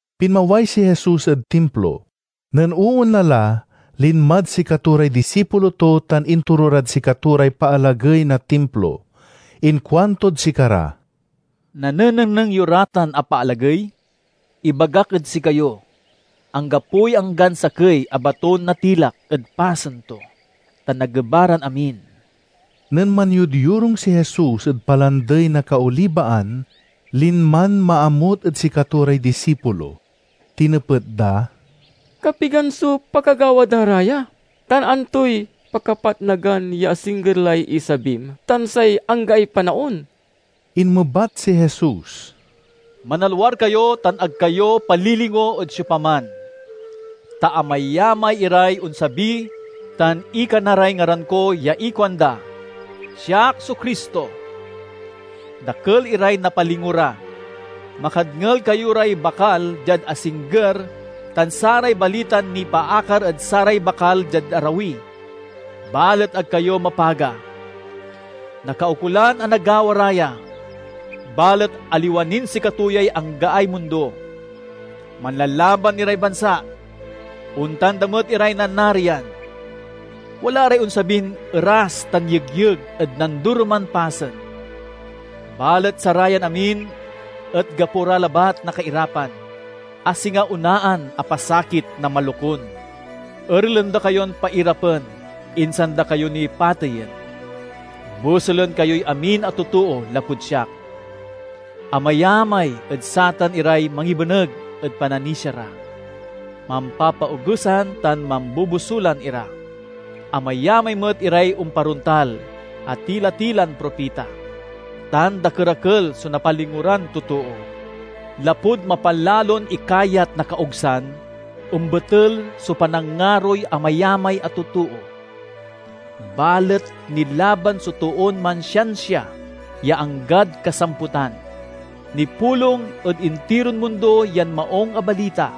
Pinmaway si Jesus ed Timplo. Nen oonla la, linmad sikato ray disipulo to tan intoro rad sikato ray paalagey na Timplo. Inkuantod sikara, "Nanenengneng yo ra tan a paalagey? Ibagak ed sikayo: anggapoy anggan sakey a baton natilak ed pasen to, ta nageba ran amin." Nen manyodyorung si Jesus ed Palandey na Kaolibaan, linman maamut ed sikato ray disipulo. Tinepet da, "Kapigan so pakagawa da ra ya, tan antoy pakapatnagan ya asingger lay isabim tan say anggaay panaon?" Inmebat si Jesus, "Manalwar kayo tan ag kayo palilingo ed siopaman. Ta amayamay iray onsabi tan ikana ray ngaran ko ya ikuanda, 'Siak so Cristo!' Dakel iray napalingo ra. Makadngel kayo ray bakal diad asingger tan saray balitan nipaakar ed saray bakal diad arawi, balet ag kayo mapaga. Nakaukolan a nagawa ra ya, balet aliwa nin sikato yay anggaay mundo. Manlalaban iray bansa; ontan da met iray nanarian. Wala ray onsabin eras tan yegyeg ed nandoroman pasen. Balet sarayan amin et gapo ra labat na kairapan, a singa onaan a pasakit na malokun. "Erelen da kayon pairapen, insan da kayo ni pateyen. Bosulen kayoy amin a totoo lapud siak. Amayamay ed satan iray mangibeneg ed pananisia ra. Mampapaogesan tan mambobosulan ira. Amayamay met iray omparontal a tila-tilan propita, tan dakerakel so napalingo ran totoo. Lapud mapalalon ikayat na kaogsan, ombetel so panangaroy amayamay a totoo. Balet nilaban so toon mansiansia ya anggad kasamputan. Nipulong ed intiron mundo yan Maung a Balita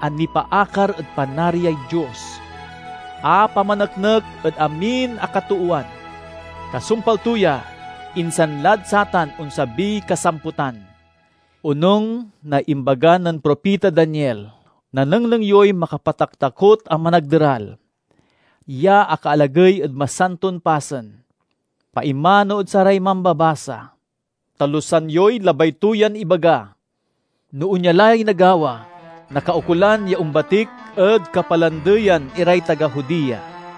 a nipaakar ed Panariay Dios, a pamaneknek ed amin a katoowan. Kasumpal to ya, insan lad satan onsabiy kasamputan." "Onung na imbaga nen propita Daniel, nanengneng yoy 'Makapataktakot a Managderal' ya akaalagey ed masanton pasen. (Paimano ed saray mambabasa: talusan yoy labay to yan ibaga!) No onya lay nagawa, nakaukolan ya ombatik ed kapalandeyan iray taga Judea.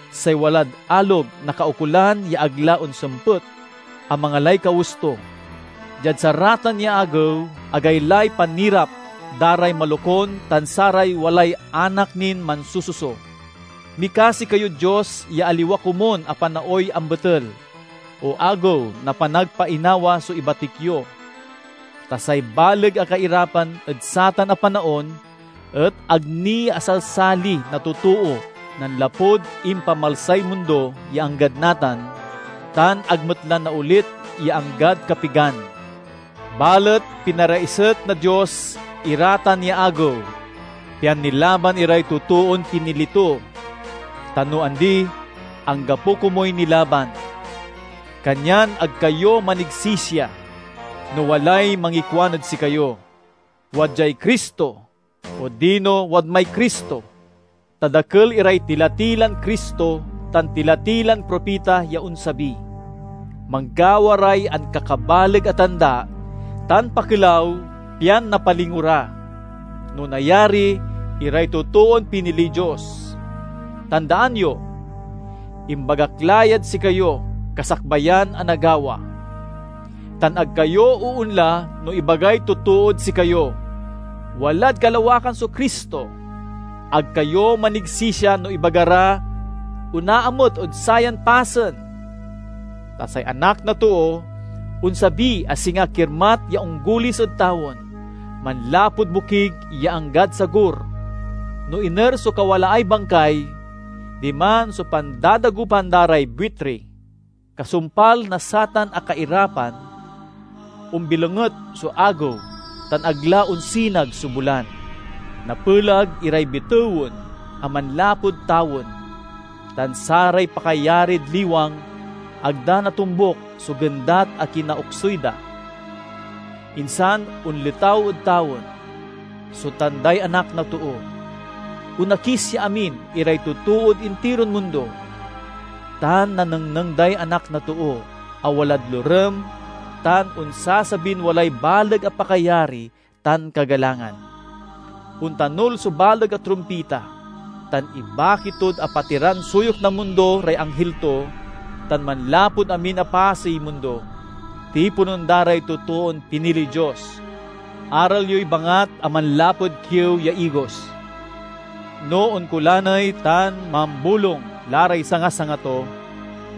Say walad alog nakaukolan ya ag la onsempet a mangalay kawes to. Diad saratan ya agew, agaylay panirap da ray malokun tan saray walay anak nin mansususo! Mikasi kayod Dios ya aliwa komun a panaoy ambetel o Agew na Panagpainawa so ibatik yo! Ta say baleg a kairapan ed satan a panaon et ag ni asalsali na totoo nanlapud impamalsay mundo ya anggad natan, tan ag met la naolit ya anggad kapigan. Balet pinaraiset na Dios ira tan ya agew, pian nilaban iray totoon pinili to; ta no andi, anggapo komuy nilaban. "Kanyan ag kayo manigsisia no walay mangikuan ed sikayo, 'Wadyay Cristo!' odino 'Wadmay Cristo!' Ta dakel iray tila-tilan Cristo tan tila-tilan propita ya onsabi. Manggawa ray ankakabaleg a tanda tan pakelaw pian napalingo ra, no nayari, iray totoon piniliy Dios. Tandaan yo! Imbagak la yad sikayo kasakbayan a nagawa. "Tan ag kayo oonla no ibagay totood sikayo, 'Walad kalawakan so Cristo!' Ag kayo manigsisia no ibaga ra, 'Onaamut ed sayan pasen!' Ta say Anak na Too onsabi a singa kirmat ya onggulis ed tawen manlapud bokig ya anggad sagur. "No iner so kawalaay bangkay, diman so pandadagopan da ray buitri." "Kasumpal na satan a kairapan, ombilonget so agew tan ag la onsinag so bulan. Napelag iray bitewen a manlapud tawen, tan saray pakayarid liwang ag da natombuk so gendat a kinaoksuy da. Insan onletaw ed tawen so tanday Anak na Too. Onakis ya amin iray totood intiron mundo, tan nanengneng day Anak na Too a walad lorem tan onsasabin walay baleg a pakayari tan kagalangan. Ontanul so baleg a trumpita, tan ibaki tod apatiran suyok na mundo ray anghil to tan, manlapud amin a pasey mundo, tiponen da ray totoon piniliy Dios." "Aral yoy bangat a manlapud kiew ya igos. No onkolaney tan mambolung la ray sanga-sanga to,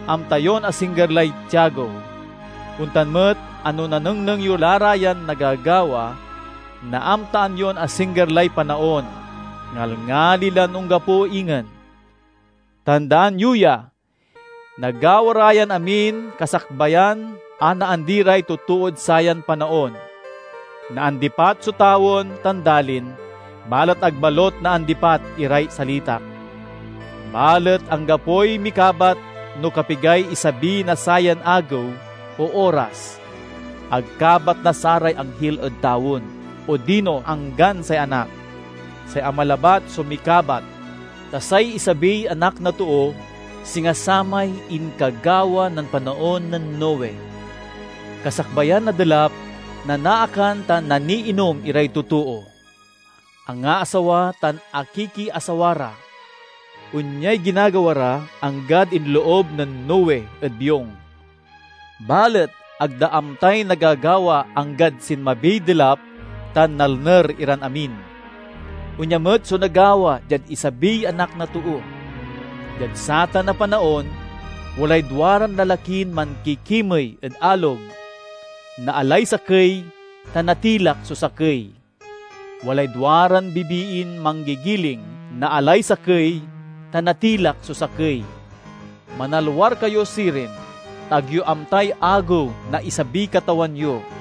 amta yon asingger lay tiagew. Ontan met a no nanengneng yo la ra yan nagagawa, naamtaan yon asingger lay panaon, ngalngali lan onggapo ingen. Tandaan yo ya! Nagawa ra yan amin kasakbayan a naandi ray totood sayan panaon. Naandipat so tawen tan dalin, balet ag balut naandipat iray salitak." "Balet anggapoy mikabat no kapigay isabi na sayan agew o oras. Ag kabat na saray anghil ed odino say anggan say Anak. Say Ama labat so mikabat. Ta say isabiy Anak na Too, singa samay inkagawa nen panaon nen Noe. Kasakbayan na delap, nanaakan tan naiinom iray totoo, angaasawa tan akikiasawa ra. Onyay ginagawa ra anggad inloob nen Noe ed biong. Balet ag da amtay nagagawa anggad sinmabiy delap tan nalner iran amin. Onya met so nagawa diad isabiy Anak na Too. Diad satan a panaon, walay duaran lalakin mankikimey ed alog; naalay sakey tan natilak so sakey. Walay duaran bibiin manggigiling; naalay sakey tan natilak so sakey. Manalwar kayo sirin, ta ag yo amtay agew na isabiy Katawan yo.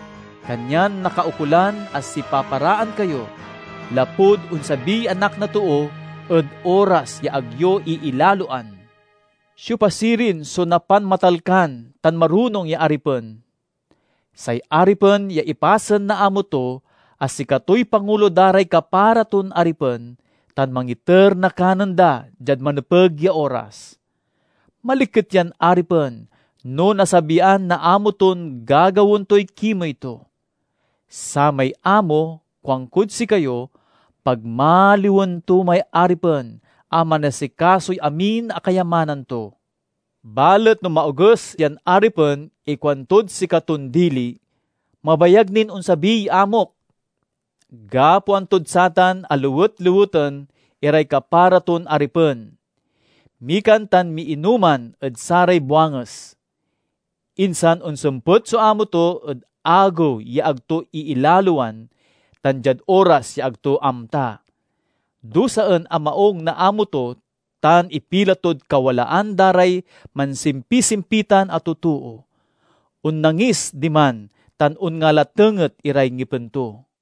Kanyan nakaukolan a sipaparaan kayo, lapud onsabiy Anak na Too ed oras ya ag yo iilaloan." "Siopa sirin so napanmatalkan tan marunong ya aripen? Say aripen ya ipasen na amo to a sikatoy pangulo da ray kapara ton aripen tan mangiter na kanen da diad manepeg ya oras. Maliket yan aripen no nasabian na amo ton gagawaen toy kimey to! Samay amo, kuankod sikayo, pagmaliwen to may aripen a manasikasoy amin a kayamanan to. Balet no maoges yan aripen ikuantod sikaton dili, 'Mabayag nin onsabiy amok!' Gapoan tod satan a lewet-leweten iray kapara ton aripen; mikan tan miinoman ed saray buanges. Insan onsempet so amo to ed agew ya ag to iilaloan tan diad oras ya ag to amta. Dusaen a maung na amo to tan ipila tod kawalaan da ray mansimpisimpitan a totoo. Onnangis diman tan onngalatenget iray ngipen to."